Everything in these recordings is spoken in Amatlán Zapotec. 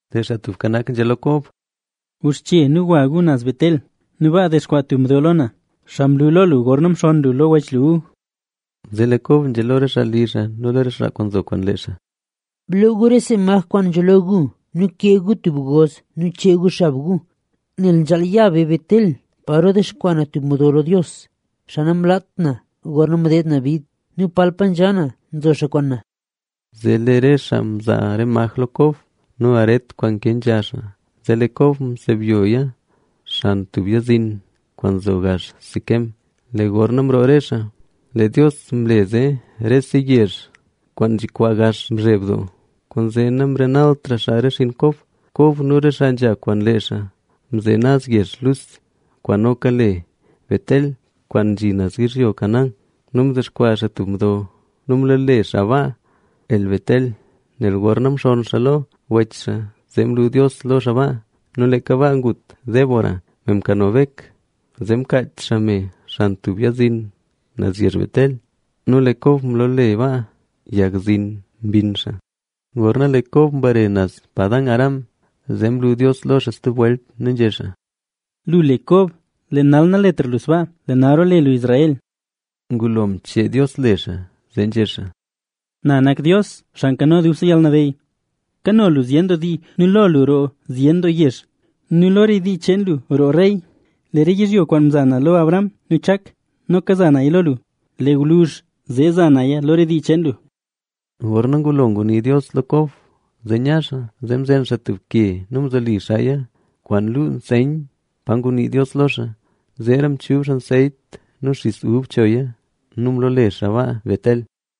Lee Xaa Tubka Nak nzhé lo Kob: —Guxche nu gwa gu naz Betel nu baa dexkwaa tub mdo lo na, xaa mlu lo lu gorna mxonn lu lo wech lu Esaú. Zee lee Kob nzhé lo re xaa li xaa nu lo re xaa nzo kwaan lee xaa: —Bloo gu rese maj kwaan nkano gu nu kee gu tub goz nu chee gu xab gu. Nel nzhaal ya be Betel, paro dexkwaa na tub mdo lo Dios, xaa namlaat na gorna mdeed na bid. Nu palpa nzha na nzo xaa kwaan na. Zee lee re xaa mzaa re maj lo Kob nu aret kwaan nke nzha xaa, zee lee Kob msebyoya xan tub yag zin, kwaan nzo gax Siquem. Lee gorna mroo re xaa, lee Dios mle zee rese yezh kwaan nzhikwaa gax mzheb doo, kwaanzee namrenaltra xaa re xinn Kob. Kob nu re xaa nzha kwaan lee xaa mzhin naz yezh kwaan le Luz, kwaan noka le Betel, kwaan nzhi naz yizhyo Canaán. Nu mdexkwaa xaa tub mdo nu mloole xaa baa El-betel,a nel gorna mxonn xaa lo wech xaa, zee mlu Dios lo xaa baa. Nu leeka baa ngut Débora, me mkano Bek, zee mkaach xaa me xan tub yag zin naz yezh Betel. Nu lee Kob mloole baa, Yag Zin Mbinn Xaa. Gorna lee Kob mbare naz Padan-aram, zee mlu Dios lo xaa stub welt, nu nzhé xaa: Lu le Kob. Lee nal naletra lu sbaa, Lee nal roole lu Israel. Ngulo mchee Dios le xaa, zee nzhé xaa: Na nak Dios, Xaa Nkano Dubse Yalnabeyy, kano lu zyen doo dii nu lo lu roo zyen doo yezh nu lo re dii cheen lu roo rey. Lee re yizhyo kwaan mza na lo Abraham nu lo Chak, noka za naya lo lu, lee gwluzh zee za naya lo re dii cheen lu. Gorna ngulo ngunii Dios lo Kob, zee nya xaa. Zee mzen Kob tub ke nu mzoli xaaya kwaan lu nseyn pa ngunii Dios lo xaa. Zeera mchub xaa anseyt nu xis ub choya. Nu mloole xaa baa Betel.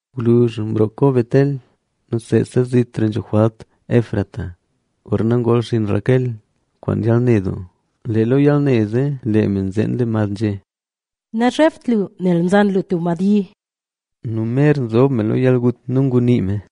Gwluzh mroo Kob Betel nu seesa zitra nzho jwalt zhin xaa Efrata, gorna ngol xinn Raquel kwaan yalne doo. Lee lo yalne zee, lee me nzen mad nzhé: —¡Nazhebt lu, nel mzan lu tub madbyi! Nu lee me mer nzob lo yalgut nu ngunii me: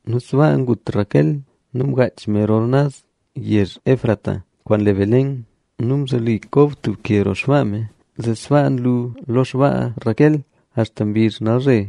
Nu sbaa ngut Raquel nu mgaach me rol naz yezh Efrata, kwaan le Belén. Nu mzoli Kob tub ke roo xpaa me, zee sbaa nlu lo xpaa Raquel, axta mbizh nalzhe.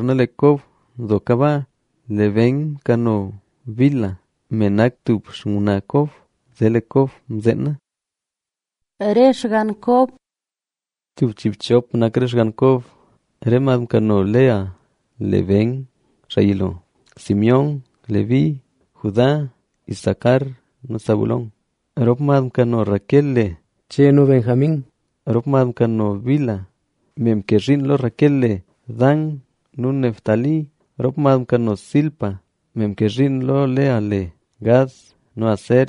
Gorna lee Kob seetaka nzho baa, lee Ben mkano Bilha, me nak tub xngwnaa Kob. Zee lee Kob mzeena. Re xgann Kob Tub chiibchop nak re xgann Kob. Re mad mkano Lea le: Ben, xaa yilo, Simeón, Leví, Judá, Isacar nu Zabulón. Rop mad mkano Raquel le: Che nu Benjamín. Rop mad mkano Bilha, me mke zhiin lo Raquel le: Dan nu Neftalí. Rop mad mkano Zilpa, me mke zhiin lo Lea le: Gad nu Aser.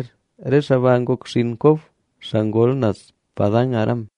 Re xaa ba ngok xinn Kob, xaa ngol naz Padan-aram.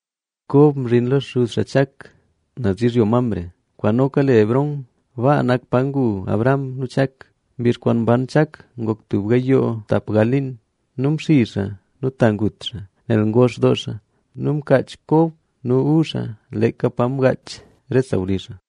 Kob mzhin lo xuz xaa Chak, naz yizhyo Mamre, kwaan noka le Hebrón. Baa nak pa ngu Abraham nu Chak. Mbizh kwaan mban Chak ngok tub gayoo tap gal liin. Nu mxizh xaa nu ta ngut xaa, nel ngox doo xaa. Nu mkaach Kob nu Esaú xaa, leeka pa mgaach re sawlizh xaa.